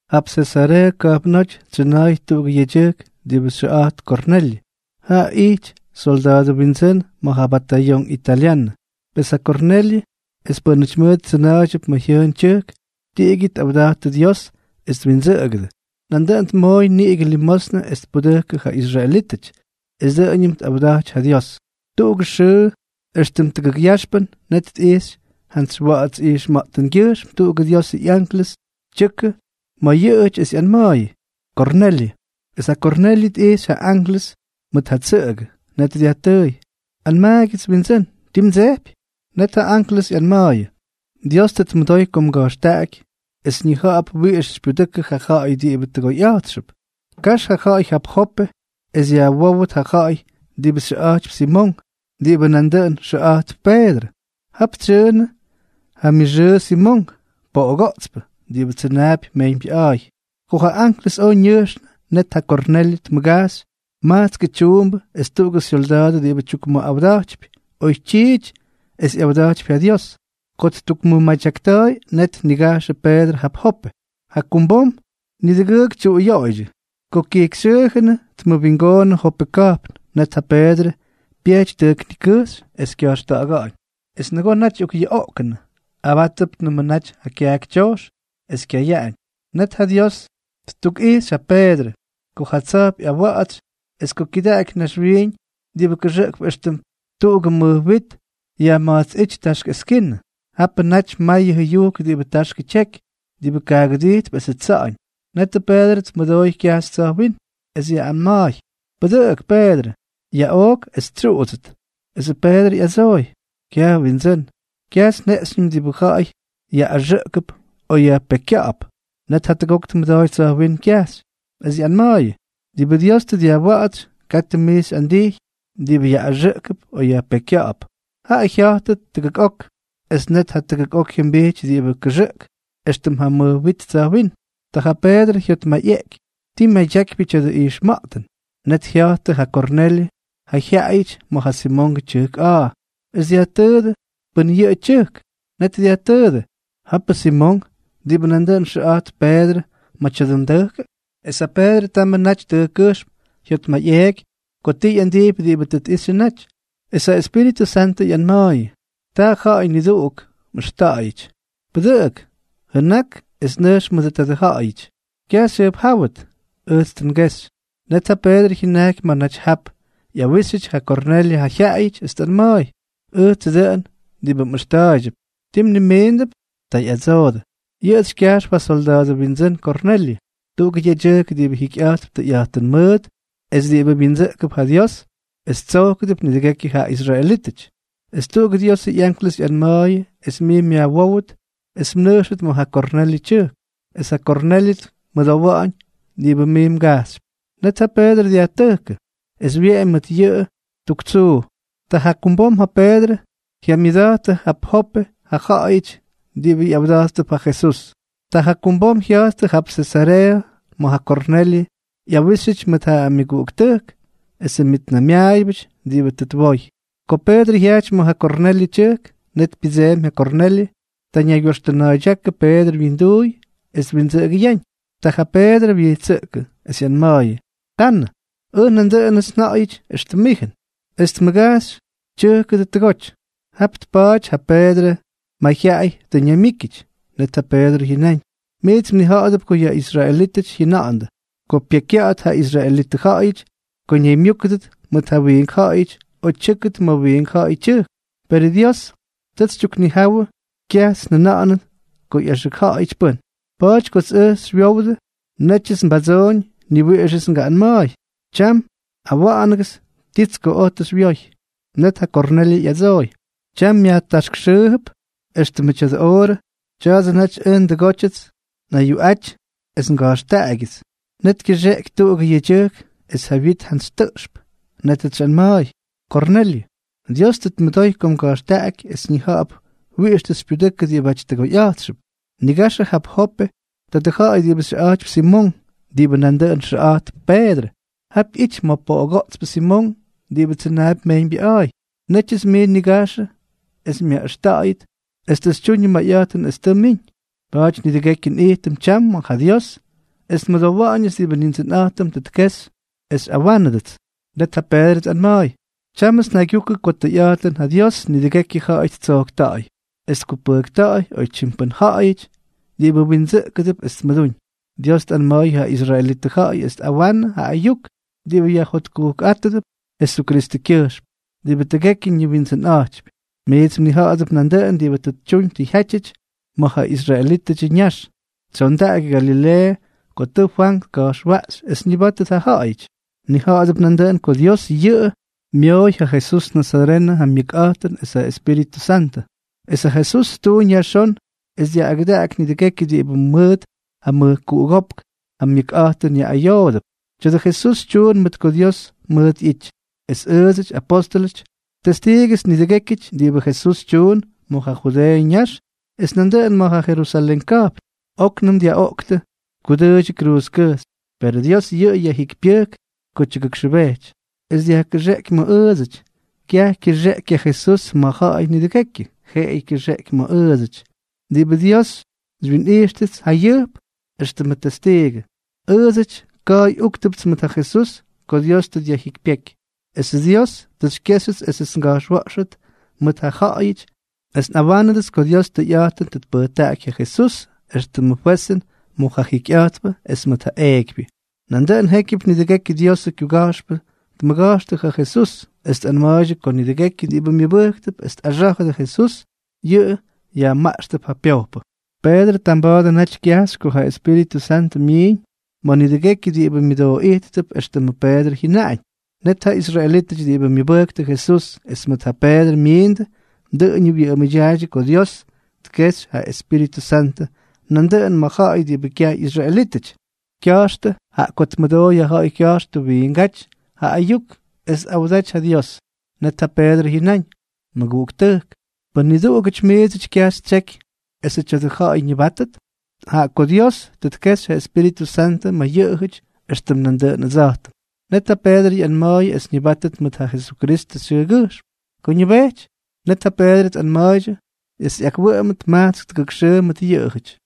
Jap Sesareeʉ ka̱jpnóty tsyʉna̱a̱y tuꞌugʉ yedyʉjk diꞌibʉ xyʉꞌa̱jt Kornelyʉ. Jaꞌa ijty solda̱a̱dʉ windsʉ́n ma̱ ja Batayonk Italyanʉ. Pes ja Kornelyʉ es pʉ́nʉty mʉʉt tsʉna̱a̱ydyʉp ma̱ jyʉʉn tyʉjk, tiꞌigyʉ tꞌawdattʉ Dios es twindsʉꞌʉgʉdʉ. Nandʉꞌʉn tmooy niꞌigʉ limosnʉ es tpudʉkʉ ja israelítʉty, es dʉꞌʉñʉm tꞌawdaty ja Dios. Tuꞌugʉ xʉʉ, éxtʉm tʉgʉk yaxpʉn, net tꞌijxy jantsy wa̱ꞌa̱ts ijxma̱ꞌtʉngyʉjxm tuꞌugʉ Diosʉ ꞌyanklʉs tyʉkʉ ma̱ yʉꞌʉ naty es ꞌyanma̱a̱yʉ: —¡Kornelyʉ! Es ja Kornelyʉ tꞌixy ja anklʉs mʉt ja tsʉꞌʉgʉ. Net dyajtʉʉy: —Anmaagyʉts, Windsʉ́n. ¿Ti mdsejpy? Net ja anklʉs ꞌyanma̱a̱yʉ: —Dios tʉ tmʉdoy ko mga̱jxtaꞌaky es ñija̱ꞌa̱p wiꞌix xypyudʉkʉ ja ja̱ꞌa̱y diꞌibʉ tʉgoyꞌa̱jtxʉp. Kax ja ja̱ꞌa̱y jap Jope es yajwówʉt ja ja̱ꞌa̱y diꞌibʉ xyʉꞌa̱jtypy Simonk, diꞌibʉ nandʉꞌʉn xyʉꞌa̱jtp Peedrʉ. Jap tsyʉʉnʉ ja myʉxʉʉ Simonk, poꞌogoꞌtspʉ diꞌibʉ tsʉnaapy mejyñbyʉꞌa̱a̱y. Ko ja anklʉs oj ñʉjxnʉ, net ja Kornelyʉ tmʉgajxy majtskʉ tyuumbʉ es tuꞌugʉ syolda̱a̱dʉ diꞌibʉ tyukmʉjotkujkꞌa̱jtypy oytyiity es yꞌawda̱jtypy ja Dios. Ko ttukmʉmadyakta̱a̱y, net tnigajxʉ Peedrʉ jap Jope. Jakumbom nidʉgʉʉk tyuꞌuyoꞌoydyʉ. Ko kyijkyxyʉꞌa̱jnʉ, tmʉwingoonnʉ Jope ka̱jpn, net ja Peedrʉ pyejty tʉjk nikʉjxy es kya̱jxta̱ꞌa̱ga̱ꞌa̱ñ. Es nʉgoo naty ꞌyokꞌyuꞌoꞌkʉnʉ, abátʉpnʉmʉ naty ja kyaaky tyojx es kyayaꞌañ, net ja Dios ttukꞌijxy ja Peedrʉ ko ja tsa̱jp ꞌyawa̱ꞌa̱tsy es ko kyʉdaꞌaky naxwiiñ diꞌibʉ kʉxʉꞌkp éxtʉm tuꞌugʉ mʉj wit ꞌyama̱jtsꞌíty taxk eskinʉ. Japʉ natyʉ may jʉyujk diꞌibʉ taxkʉ tyeky, diꞌibʉ kaagʉdijtp esʉ tsa̱ꞌa̱ñ. Netʉ Peedrʉ tmʉdooy kyajxy tsa̱jwínm, es ꞌyanma̱a̱yʉ: —Pʉdʉꞌʉk, Peedrʉ. Yaꞌook es xytsyuꞌudsʉt. Esʉ Peedrʉ ꞌyadsooy: —Kyaj Windsʉ́n. Kyajts njeꞌxyñʉm diꞌibʉ ja̱ꞌa̱y yaꞌꞌaxʉꞌkʉp o yajpekykya̱ꞌa̱p. Net jatʉgok tmʉdooy tsa̱jwínm kyajxy, es ꞌyanma̱a̱yʉ: —Diꞌibʉ Dios tʉ dyajwa̱ꞌa̱tsy, katʉ mij xyꞌandijy diꞌibʉ yaꞌꞌaxʉꞌkʉp o yajpekykya̱ꞌa̱p. Jaꞌa jya̱jtʉ tʉgʉk ok, es net jatʉgok jyʉmbijty diꞌibʉ kʉxʉꞌk éxtʉm ja mʉj wit tsa̱jwínm. Ta ja Peedrʉ jyotmayꞌeꞌky ti myadyakypyʉ tya̱dʉ ijxma̱ꞌtʉn. Net jya̱jttʉ ja Kornelyʉ ja jyaꞌayʉty ma̱ ja Simongʉ tyʉjk a̱a̱, es dyajtʉʉdʉ pʉn yʉꞌʉ tyʉjk. Net dyajtʉʉdʉ: —¿Japʉ Simonk, diꞌibʉ nandʉꞌʉn xyʉꞌa̱jtp Peedrʉ, ma̱ tya̱dʉ tʉjkʉ? Es ja Peedrʉ tamʉ naty tʉjkkʉjxm jyotmayꞌeeky ko ti ꞌyandijpy diꞌibʉ tʉ tꞌixyʉ naty. Es ja Espíritʉ Santʉ ꞌyanma̱a̱yʉ: —Ta ja̱ꞌa̱y nidʉgʉʉk mꞌʉxta̱ꞌa̱yʉty. Pʉdʉꞌʉk, jʉnak es nʉjx mʉdʉ tadʉ ja̱ꞌa̱yʉty. Kyaj xyjʉjpjáwʉt. Ʉjts tʉ ngexy. Net ja Peedrʉ jyʉnajky ma̱ naty jap ꞌyawíxyʉty ja Kornelyʉ ja jyaꞌayʉty, es tꞌanma̱a̱y: —Ʉjtsʉ dʉꞌʉn diꞌibʉ mꞌʉxta̱a̱ydyʉp. ¿Ti mnimiindʉp? Ta ꞌyadsoodʉ: —Yʉꞌʉts xykyajxp ja solda̱a̱dʉ windsʉ́n Kornelyʉ, tuꞌugʉ yedyʉjk diꞌibʉ jikyꞌa̱jtp tʉyꞌa̱jtʉn mʉʉt es diꞌibʉ wyindsʉꞌkʉp ja Dios, es tsojkʉdʉp nidʉgekyʉ ja israelítʉty. Es tuꞌugʉ Diosʉ ꞌyanklʉs ꞌyanma̱a̱yʉ es mij myajwówʉt es mnʉjxʉt ma̱ ja Kornelyʉ tyʉjk. Es ja Kornelyʉ tmʉdowa̱ꞌa̱ñ diꞌibʉ mij mgajxypy. Net ja Peedrʉ dyajtʉjkʉ, es wyeꞌemy mʉt yʉꞌʉ tuk tsuu. Ta jakumbom ja Peedrʉ jyamyʉda̱jtʉdʉ ja Jope ja̱ꞌa̱yʉty diꞌibʉ ꞌyawda̱jttʉp ja Jesús. Ta jakumbom jya̱jttʉ jap Sesareeʉ ma̱ ja Kornelyʉ ꞌyawíxyʉty mʉt ja myʉguꞌuktʉjk esʉ myʉtnaymyaayʉbʉty diꞌibʉ tʉ twoy. Ko Peedrʉ jyajty ma̱ ja Kornelyʉ tyʉjk, net pyʉdseemy ja Kornelyʉ. Ta ñaygyoxtʉna̱a̱ydyákʉ Peedrʉ wyinduuy es twindsʉꞌʉgʉyaꞌañ. Ta Peedrʉ wyijtsʉꞌkʉ, es ꞌyanma̱a̱yʉ: —Tanʉ. Ʉj nandʉꞌʉnʉts nja̱ꞌa̱yʉty éxtʉm mijʉn. Es tmʉgajxy tyʉjkʉdʉ tʉgoty. Jap tpaty ja Peedrʉ mayjyaꞌay tʉ ñaymyíkyʉty. Net ja Peedrʉ jyʉnáñ: —Miits mnija̱ꞌa̱dʉp ko yʉ israelítʉty jyʉna̱ꞌa̱ndʉ ko pyekykya̱ꞌa̱t ja israelitʉ ja̱ꞌa̱yʉty ko ñaymyúkʉdʉt mʉt ja wiink ja̱ꞌa̱yʉty o tyʉ́kʉt ma̱ wiink ja̱ꞌa̱yʉ tyʉjk. Perʉ Dios tʉts xytyuknijawʉ kyajts njʉna̱ꞌa̱nʉt ko ꞌyaxʉkja̱ꞌa̱yʉty pʉ́n. Pa̱a̱ty kots oj xywyowdʉ, nétyʉts mbadsoꞌoñ, ni wiꞌixʉts ngaꞌꞌanma̱a̱y. Tyam awa̱ꞌa̱nʉgʉts tits ko oj tʉ xywyoy. Net ja Kornelyʉ ꞌyadsooy: —Tyam mya̱jtaxkxʉʉp, éxtʉmʉ tya̱dʉ oorʉ, tya̱a̱dsʉ naty ʉj ndʉgótyʉts nꞌayuꞌaty es nga̱jxtaꞌagyʉts. Net kyʉxeꞌky tuꞌugʉ yedyʉjk es ja wyit jantsy tʉꞌxp. Nétʉts xyꞌanma̱a̱y: “Kornelyʉ, Dios tʉ tmʉdoy ko mga̱jxtaꞌaky es ñija̱ꞌa̱p wiꞌix tʉ xypyudʉkʉ diꞌibáty tʉgoyꞌa̱jtxʉdʉp. Nigaxʉ jap Jope tadʉ ja̱ꞌa̱y diꞌibʉ xyʉꞌa̱jtypy Simonk, diꞌibʉ nandʉꞌʉn xyʉꞌa̱jtp Peedrʉ. Jap ꞌyity ma̱ poꞌogoꞌtspʉ Simonk diꞌibʉ tsʉnaapy mejyñbyʉꞌa̱a̱y.” Nétyʉts mij nnigajxʉ es myaꞌʉxta̱ꞌa̱yʉt, es tʉ xytyuñʉ mayꞌa̱jtʉn es tʉ mmiñ. Pa̱a̱ty nidʉgekyʉ nꞌijtʉm tyam ma̱ ja Dios, es nmʉdowa̱ꞌa̱ñʉts diꞌibʉ Nindsʉnꞌa̱jtʉm tʉ tkexy es xyꞌawánʉdʉts. Net ja Peedrʉ tꞌanma̱a̱y: —Tyámʉts njaygyukʉ ko tʉyꞌa̱jtʉn ja Dios nidʉgekyʉ ja̱ꞌa̱y ttsojkta̱ꞌa̱y, es tkupʉjkta̱ꞌa̱y oytyim pʉ́n ja̱ꞌa̱yʉty diꞌibʉ windsʉꞌkʉdʉp es tmʉdúñ. Dios tꞌanma̱a̱y ja israelitʉ ja̱ꞌa̱y es tꞌawa̱ꞌa̱nʉ ja ayuk diꞌibʉ yajjotkujkꞌátʉdʉp Jesukristʉkyʉjxm, diꞌibʉ tʉgekyʉ ñiwindsʉnꞌa̱jttaapy. Miits mnija̱ꞌa̱dʉp nandʉꞌʉn diꞌibʉ tʉ tyuñ tʉ jyátyʉty ma̱ ja israelítʉdyʉ ñax, tsyondaky Galileeʉ ko tʉ Fwank tka̱jxwaꞌxy es ñʉbátʉt ja ja̱ꞌa̱yʉty. Mnija̱ꞌa̱dʉp nandʉꞌʉn ko Dios yʉꞌʉ myooy ja Jesús nazarenʉ ja myʉkꞌa̱jtʉn es ja Espíritʉ Santʉ. Es ja Jesús ttuuñ yajxón es dyaꞌꞌagʉdaky nidʉgekyʉ diꞌibʉ mʉt ja mʉjkuꞌugópk ja myʉkꞌa̱jtʉn ꞌyayoodʉp. Tya̱a̱dʉ Jesús tyuun mʉt ko Dios mʉʉt ꞌyity. Es ʉʉdsʉty, apóstʉlʉty, testiigʉts nidʉgékyʉty diꞌibʉ Jesús tyuun ma̱ ja Judeeʉ ñax es nandʉꞌʉn ma̱ ja Jerusalén ka̱jpn. Oknʉm dyaꞌoꞌktʉ, tkudʉʉydyʉ kruuzkʉjxy. Perʉ Dios yʉꞌʉ yajjikypyʉjk ko tyʉgʉkxʉbejty, es dyajkʉxeꞌky ma̱ ʉʉdsʉty. Kyaj kyʉxeꞌky ja Jesús ma̱ ja̱ꞌa̱y nidʉgekyʉ, jeꞌeyʉ kyʉxeꞌky ma̱ ʉʉdsʉty diꞌibʉ Dios xywyinꞌijxtʉts jayʉjp éxtʉmʉ testiigʉ. Ʉʉdsʉty ka̱a̱y úktʉpts mʉt ja Jesús ko Dios tʉ dyajjikypyéky. Esʉ Dios tʉ xykyéxyʉts esʉts nga̱jxwa̱ꞌxʉt mʉt ja ja̱ꞌa̱yʉty es nꞌawánʉdʉts ko Dios tʉyꞌa̱jtʉn tʉ tpʉjtaꞌaky ja Jesús éxtʉmʉ fwezʉn mʉt ja jiikypyʉ es mʉt ja eekypyʉ. Nandʉꞌʉn jékyʉp nidʉgekyʉ Diosʉ kyuga̱jxpʉ tmʉga̱jxtʉ ja Jesús, es tꞌanma̱a̱ydyʉ ko nidʉgekyʉ diꞌibʉ myʉbʉjktʉp es tꞌaxá̱jʉdʉ Jesús, yʉꞌʉ yajmaꞌxtʉp ja pyojpʉ. Peedrʉ tamba̱a̱dʉ naty kyajxy ko ja Espíritʉ Santʉ myiiñ ma̱ nidʉgekyʉ diꞌibʉ myʉdooꞌijttʉp éxtʉmʉ Peedrʉ jyʉnaꞌañ. Net ja israelítʉty diꞌibʉ myʉbʉjktʉ Jesús es mʉt ja Peedrʉ myiindʉ, dʉꞌʉñʉ wyʉꞌʉmʉdyaaydyʉ ko Dios tkejxy ja Espíritʉ Santʉ nandʉꞌʉn ma̱ ja̱ꞌa̱y diꞌibʉ kyaj ꞌyisraelítʉty, jaꞌa ko tmʉdooy ja ja̱ꞌa̱y kya̱jxtʉ wiingáty ja ayuk es tꞌawdaty ja Dios. Net ja Peedrʉ jyʉnáñ: —Mʉguꞌuktʉjk, ¿pʉ́n niduꞌugʉty miidsʉty kyaj ttseky esʉ tya̱dʉ ja̱ꞌa̱y ñʉbáttʉt?, jaꞌa ko Dios tʉ tkexy ja Espíritʉ Santʉ ma̱ yʉꞌʉjʉty éxtʉm nandʉꞌʉn ʉdsa̱jtʉm. Net ja Peedrʉ ꞌyanma̱a̱yʉ es ñʉbáttʉt mʉt ja Jesukristʉ xyʉʉgyʉjxm. Ko ñʉbejty, net ja Peedrʉ tꞌanma̱a̱ydyʉ es ꞌyakwʉꞌʉmʉt majtsk tʉgʉk xʉʉ mʉt yʉꞌʉjʉty.